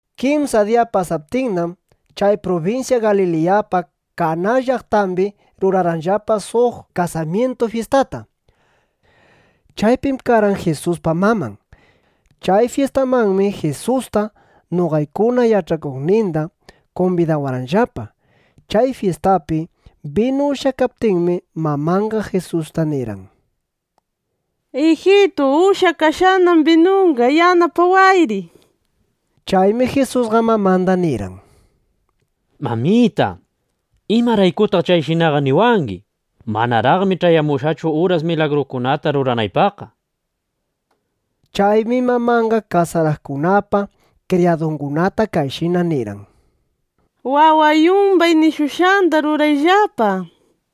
Kimsa diya pasaptinnam, chay prubinsya Galiliyapa Kaná llaqtambi rurarqanllapa suq kasamyintu fyistata. Chaypim karqan Jisuspa maman. Chay fyistamanmi Jisusta, noqaykuna yach'akuqninda kumbidawarqanllapa. Chay fyistapi binu ushyakaptinmi, mamanqa Jisusta nirqan: —Ijitu, ushyakashqanam binunqa. Yanapayri, nishpa. Chaymi Jisusqa mamanda nirqan: —Mamita, ¿imaraykutaq chayshinaqa niwangi? Manaraqmi ch'ayamunchu uras, milagrukunata ruranaypaqqa, nishpa. Chaymi mamanqa kasaraqkunapa kriyadungunata kayshina nirqan: —Waway yumbay nishushqanda rurayllapa, nishpa.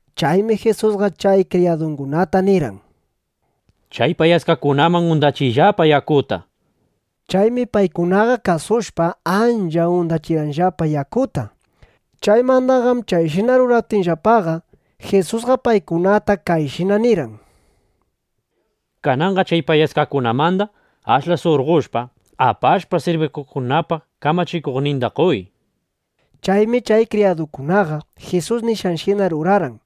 Chaymi Jisusqa chay kriyadukunata nirqan: —Chay payaskakunaman undachiyllapa yakuta, nishpa. Chaymi paykunaqa kasushpa, ancha undachirqanllapa yakuta. Chaymandaqam chayshina ruraptinllapaqa, Jisusqa paykunata kayshina nirqan: —Kananqa chay payaskakunamanda ashla surqoshpa, apashpa, sirbisyukunapa kamachikuqninda qoy, nishpa. Chaymi chay kriyadukunaqa Jisus nishqanshina rurarqan.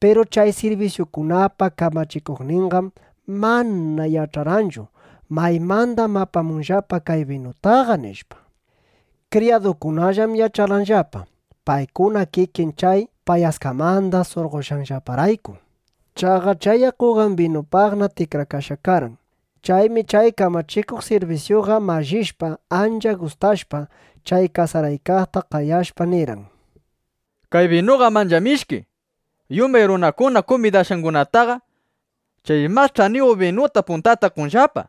Piru chay sirbisyukunapa kamachikuqninqam mana yach'arqanchu: Maymandam apamunllapa kay binutaqa, nishpa. Kriyadukunallam yach'arqanllapa, paykuna kikin chay payaskamanda surqoshqanllaparayku. Chaqa chay yakuqam binupaqna tikrakashqa karqan. Chaymi chay kamachikuq sirbisyuqa mallishpa, ancha gustashpa, chay kasaraykaqta qayashpa, nirqan: —¡Kay binuqam ancha mishki! Yumbay runam kumbidashqangunataqa chay mas ch'aniyuq binuta puntata qonllapa.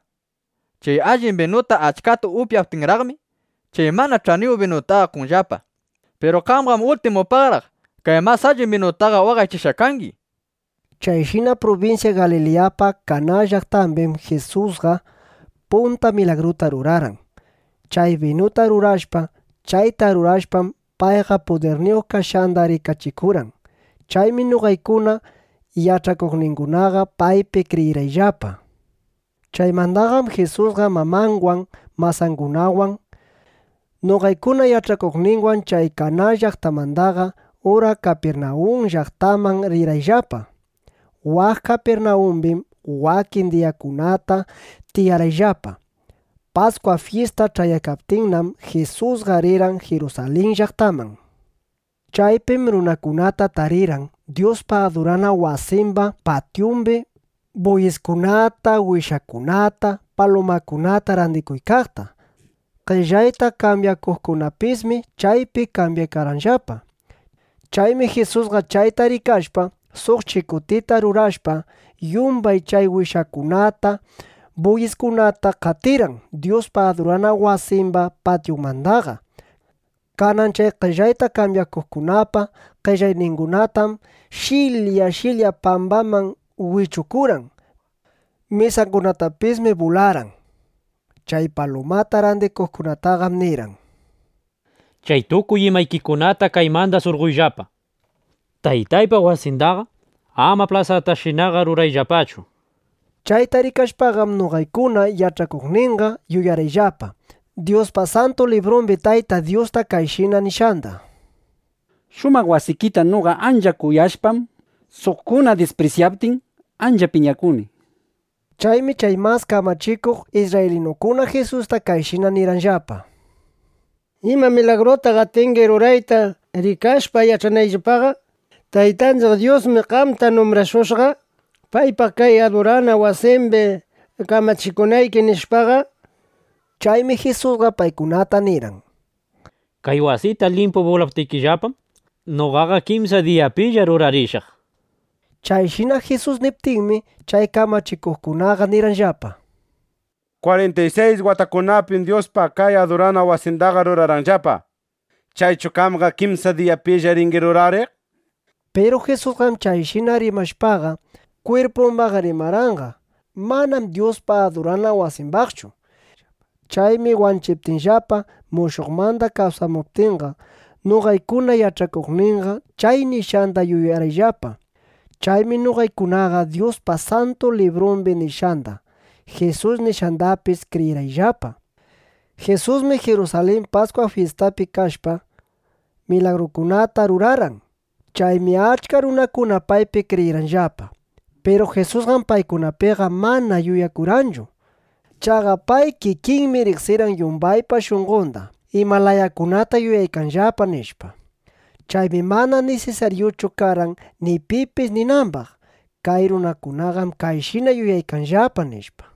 Chay allin binuta achkata upyaptinraqmi, chay mana ch'aniyuq binutaqa qonllapa. Piru qamqam ultimupaqraq kay mas allin binuykitaqa waqaychashqa kangi, nishpa. Chayshina prubinsya Galiliyapa Kaná llaqtambim Jisusqa punta milagruta rurarqan, chay binuta rurashpa. Chayta rurashpam, payqa pudirniyuq kashqanda rikachikurqan. Chaymi noqaykuna yach'akuqningunaqa paypi kriyirqayllapa. Chaymandaqam Jisusqa mamanwan, masangunawan, noqaykuna yach'akuqninwan chay Kaná llaqtamandaqa ura Kapirnawun llaqtaman rirqayllapa. Waq Kapirnawumbim wakin diyakunata tiyarqayllapa. Paskwa fyista ch'ayaykaptinnam, Jisusqa rirqan Jirusalin llaqtaman. Chaypim runakunata tarirqan Dyuspa adurana wasimba patyumbi buyiskunata, wishakunata, palumakunata randikuykaqta. Qellayta kambyakuqkunapismi chaypi kambyaykarqanllapa. Chaymi Jisusqa chayta rikashpa, suq chikutita rurashpa, yumbay chay wishakunata, buyiskunata qatirqan Dyuspa adurana wasimba patyunmandaqa. Kanan chay qellayta kambyakuqkunapa qellayningunatam sh'ilya sh'ilya pambaman wichukurqan. Mesangunatapismi bularqan. Chay palumata randikuqkunataqam nirqan: —Chay tukuy imaykikunata kaymanda surqoyllapa. Taytaypa wasindaqa ama plasatashinaqa rurayllapachu, nishpa. Chayta rikashpaqam, noqaykuna yach'akuqninqa yuyarqayllapa Dyuspa Santu Librumbi Tayta Dyusta kayshina nishqanda: “Shumaq wasikita noqa ancha kuyashpam, suqkuna disprisyaptin, ancha piñakuni”, nishpa. Chaymi chay mas kamachikuq isrraylinukuna Jisusta kayshina nirqanllapa: —¿Ima milagrutam atingi rurayta, rikashpa, yach'anayllapaqa: Taytanchiq Dyusmi qamta numbrashushqa, paypa kay adurana wasimbi kamachikunayki, nishpaqa? Chaymi Jisusqa paykunata nirqan: —Kay wasita limpu bulaptikillapam, noqaqa kimsa diyapilla rurarishaq, nishpa. Chayshina Jisus niptinmi, chay kamachikuqkunaqa nirqanllapa: —Kwarinta y sayis watakunapim Dyuspa kay adurana wasindaqa rurarqanllapa. ¿Chaychu qamqa kimsa diyapilla ringi rurariq? nishpa. Piru Jisusqam chayshina rimashpaqa, kwirpumbaq rimarqanqa; manam Dyuspa adurana wasimbaqchu. Chaymi wanchiptinllapa, mushuqmanda kawsamuptinqa, noqaykuna yach'akuqninqa chay nishqanda yuyarqayllapa. Chaymi noqaykunaqa Dyuspa Santu Librumbi nishqanda, Jisus nishqandapis kriyirqayllapa. Jisusmi Jirusalin Paskwa fyistapi kashpa, milagrukunata rurarqan. Chaymi achka runakuna paypi kriyirqanllapa. Piru Jisusqam paykunapiqa mana yuyakurqanchu. Chaqa pay kikinmi riqsirqan yumbaypa shunqonda, ima layakunata yuyaykanllapa, nishpa. Chaymi mana nisisaryuchu karqan ni pipis ninambaq: Kay runakunaqam kayshina yuyaykanllapa, nishpa.